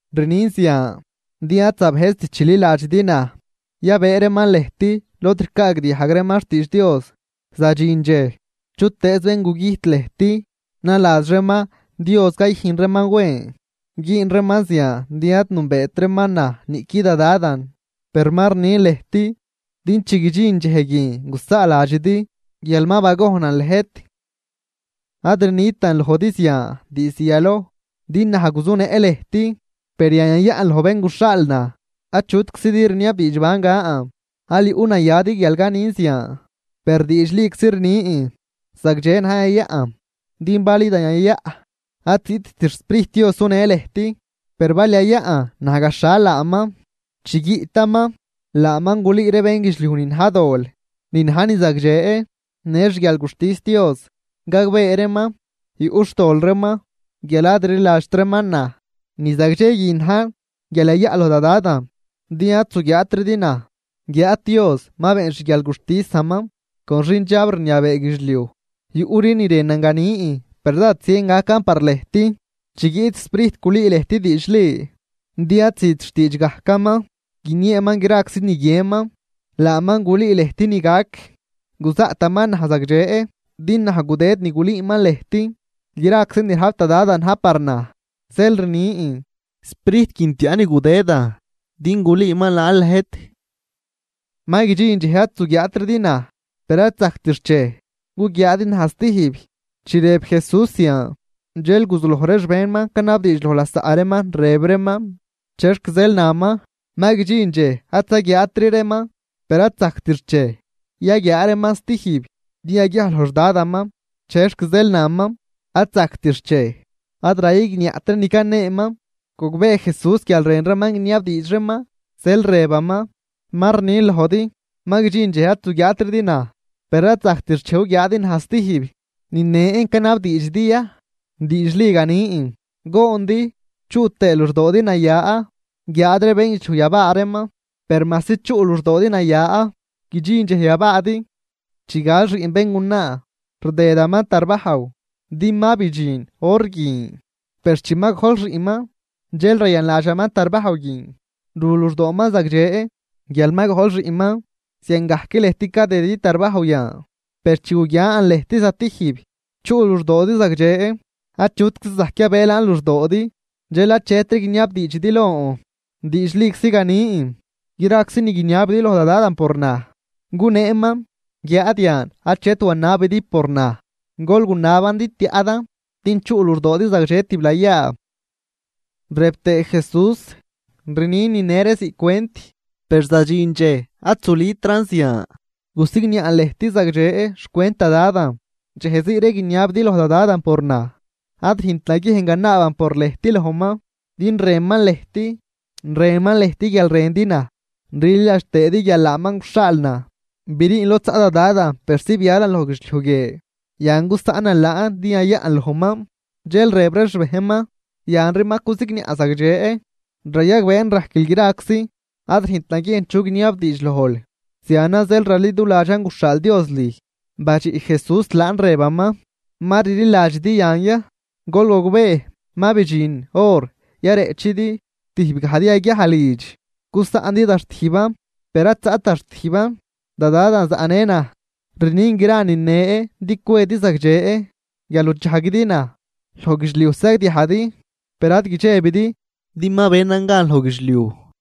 ’Rnin zian, din ad zabëjzt chililadxidi naj. Yabëë reeman lëjt lod ricaagdiajg reeman xtiidx Dios, zadxin dxej, chutëëz bén gugüjt lëjt naladx reeman Dios cayüjn reeman wen. Güün reeman zian din ad nünbeet reeman naj niꞌqui da Dadan. Per ma rnin lëjt, din chi guidxin dxej guin gusaaladxidi guial ma bagojnan lëjt. ’Ad rnitan lojdi zian diizd yaloj, din naj guzunëꞌ lëjt. Per yan yayaꞌn loj bén guxhaal naj. Achutczidi rniabdiidx ban gan, aal yuꞌnayadi guial canin zian. Per diidxliczi rnin: zagdxe najn yayaꞌn. Din bal idan yayaꞌ, ad ziꞌtt xSprijt Dios sunë lëjt, per bal yayaꞌn, naj gaxhal laaman. Chi guiꞌtaman, laaman gulüü ree bénguidxliuj ni na̱j dol, ni na̱j ni zagdxe, në xguialguxtis Dios. Gagbee reeman yuꞌ xtol reeman, guial ad rliladxt reeman naj. Ni zagdxe guin na̱j guial yayaꞌ loj da Dadan din ad zuguiaatridi naj. Guiáad Dios ma been xguialguxtisaman con xindxab rniabee guidxliuj. ’Yuꞌri ni rënan ganin, per dád zien gacan par lëjt. Chi guiꞌt Sprijt gulüü lëjt diidxli, din ad züt xtiidx gajcaman, guinieeman graczi ni guienman, laaman gulüü lëjt ni gac. Guzaꞌtaman naj zagdxe, din naj gudëd ni gulüüman lëjt. Graczi ni rajp da Dadan na̱j par naj, zeel rnin, Sprijt guin tiaꞌ ni gudëdan din gulüüman laan lëjt. ’Ma guidxin dxej ad zuguiaatridi naj, per ad zajct xchej, guguiaadi naj stijb. Chi rëb Jesús zian, dxel guzuloj ree xbejnman canabdiidx loj lasaꞌ reeman, rëb reeman: ―¿Chexc zeel naman, ma guidxin dxej ad zaguiaatri reeman, per ad zajct xchej, yaguiaa reeman stijb, din yaguiaj loj xDadaman? ¿Chexc zeel naman: “Ad zajct xchej”? Ad rayigniaꞌt ree ni caneeman. Gogbee Jesús guial rën reeman guiniabdiidx reeman, zeel rëbaman: ―Ma rnin lojdi, ma guidxin dxej ad zuguiaatridi naj, per ad zajct xchej, guguiaadi naj stijb. ¿Ni nen canabdiidxidi ya? Diidxli ganin, goondi chuꞌ tëë luxdoodi naya, guiáad ree bénguidxliuj yabaa reeman. Per majsi chuꞌ luxdoodi naya, guidxin dxej yabaadi. Chi gal xiꞌn béngunaa, rdëdaman tarbajw, din ma bidxin hor guin. Per chi ma gojl xiꞌnman, dxel rayanladxaman tarbajw guin, ru luxdooman zagdxe, guial ma gojl xiꞌnman. Ziangajc lëjt cadëdidi tarbajw yan, per chi guguian lëjt zatijb, chuꞌ luxdoodi zagdxe, achutczi zajc yabëë laan luxdoodi. ’Dxel achetri guiniabdiidxidi lon. Diidxliczi ganin, graczi ni guiniabidi loj da Dadan por naj, guneeman. Guiáad yan achet wanabidi por naj, gol gunaban din tiaꞌdan, din chuꞌ luxdoodi zagdxe tiblayaa. Rëb tëë Jesús: ―Rnin nine ree ziꞌc cwent, per zadxin dxej ad zulütran zian, gusigniaꞌn lëjt zagdxe xcwent da Dadan. Dxej zii ree guiniabidi loj da Dadan por naj, ad rüjnt naguiejn ganaaban por lëjt lojman, din rënman lëjt, rënman lëjt guial rëndi naj rliladx tëëdi guial laaman guxhaal naj. Briin lod zaꞌ da Dadan persi bialan loj guidxliuj guie, yan gusaꞌnan laan din yayaꞌn lojman. Dxel rëb ree xbejnman: ―Yanri ma cusigniaꞌl zagdxe. Rayagbeen rajquil graczi, ad rüjnt naguiejn chu guiniabdiidx lojl. Zianan zeel raliduladxan guxhaal Dios lüj. Badxiꞌ Jesús laan rëbaman: ―¿Ma rliladxidi yan ya? Gol gogbee, ma bidxin hor yareꞌchidi, tijb gajdi yaguiaj lidx, gusaꞌndi da xtijban. Per ad zaꞌt da xtijban, da Dadan zaꞌnë naj. Rnin gra nine din cwedi zagdxe guial nuchajguidi naj. Loj guidxliuj sagdiajdi, per ad guidxebidi, din ma benan gan loj guidxliuj.